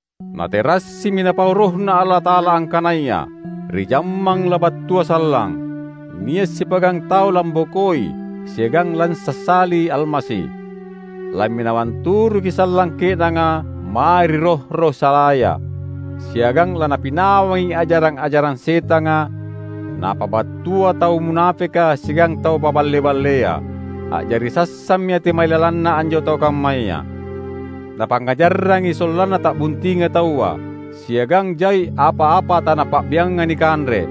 Naterassimi Napau RohNa Allata’ala angkanaya ri jammang labattua sallang, nia’ sipa’gang tau lambokoi siagang lansassali Almasi. Lamminawang turuki sallang ke’nanga mae ri roh-roh salaya, siagang lanapinawangi ajarang-ajarang setanga, napabattua tau munapeka siagang tau paballe-ballea. A’jari sassammi ati mailalanna anjo tau kammaya. Napangngajarrangi sollanna ta’buntinga taua; siagang jai apa-apa tanapa’bianga nikanre.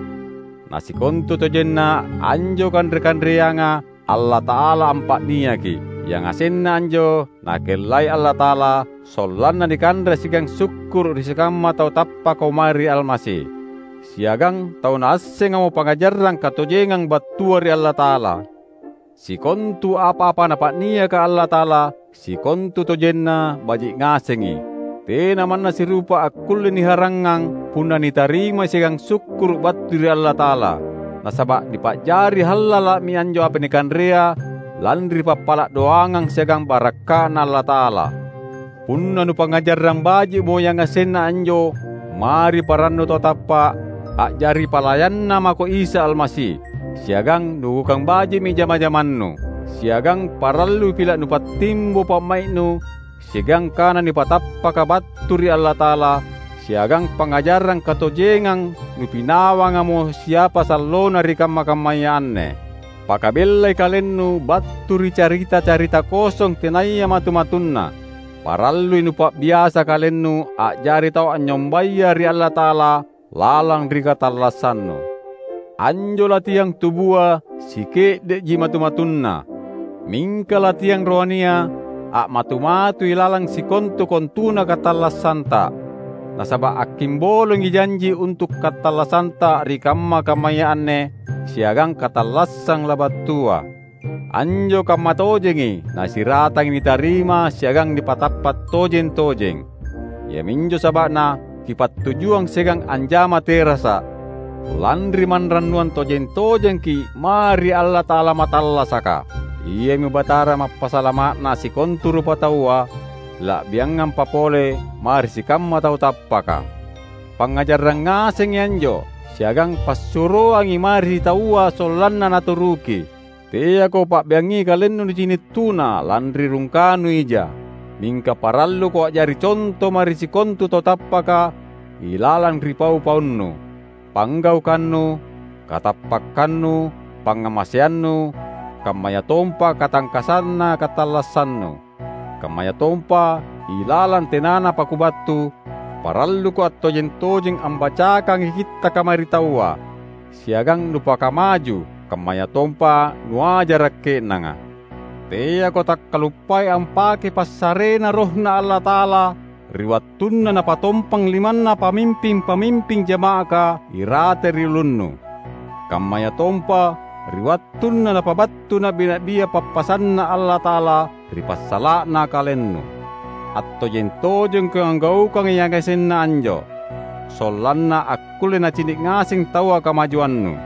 Na sikontutojenna anjo kanre-kanreanga Allata’ala ampa’niaki. Yangasenna anjo Nakellai Allata’ala sollanna nikanre siagang sukkuru’ ri sikamma tau tappakamo mae ri Almasi siagang tau naassengamo pangajarang katojengang battua ri Allata’ala. Sikontu apa-apa Napa’niaka Allata’ala sikontutojenna baji’ ngasengi; tena manna sirupa akkulle niharangngang punna nitarimai siagang sukkuru’ battu ri Allata’ala. Nasaba’ nipa’jari hallala’mi anjo apa nikanrea lanri pappala’ doangang siagang barakka’Na Allata’ala. Punna nupangngajarrang baji’mo yangasenna anjo mae ri parannu tau tappa’, a’jari palayanNa mako Isa Almasi, siagang nugaukang baji’mi jama-jamannu. Siagang parallui pila’ nupattimbo pa’mai’nu siagang kana nipatappaka battu ri Allata’ala, siagang pangngajarang katojengang nupinawangamo siapa sallona ri kamma-kammaya anne. Pakabellai kalennu battu ri carita-carita kosong tenaya matu-matunna. Parallui nupa’biasa kalennu a’jari tau anynyombaya ri Allata’ala lalang ri katallassannu. Anjo latihang tubua sike’de’ji matu-matunna; mingka latihang rohania a’matu-matui lalang sikontu-kontuna katallassanta, nasaba’ akkimbolongi janji untu’ katallassanta ri kamma-kammaya anne siagang katallassang labattua. Anjo kammatojengi na siratangi nitarima siagang nipatappa’ tojeng-tojeng. Iaminjo saba’na kippattujuang siagang anjama terasa’, lanri manrannuang tojeng-tojengki’ mae ri Allata’ala mattallasaka; Iami Batara Mappasalama’na sikontu rupataua, la’biangampa pole mae ri sikamma tau tappaka. Pangngajarrang ngasengi anjo siagang passuroangi mae ri taua sollanna naturuki. Teako pa’biangi kalennu nicini’ tuna lanri rungkanu ija. Mingka paralluko a’jari conto mae ri sikontu tau tappaka ilalang ri pau-paunu, panggaukannu, katappakkannu, pangngamaseannu, kammayatompa katangkassanna katallassannu. Kammayatompa, ilalang tenanapa kubattu, paralluko attojeng-tojeng ambacakangi Kittaka mae ri taua, siagang nupakamaju, kammayatompa nuajara’ ke’nanga. Teako takkaluppai ampakei passareNa RohNa Allata’ala ri wattunna napatompang limanna pamimping-pamimping jama’aka irate ri ulunnu, kammayatompa ri wattunna napabattu na’bi-na’bia pappasanNa Allata’ala ri passala’na kalennu. Attojeng-tojengko anggaukangi yangasenna anjo, sollanna akkulle nacini’ ngaseng taua kamajuannu.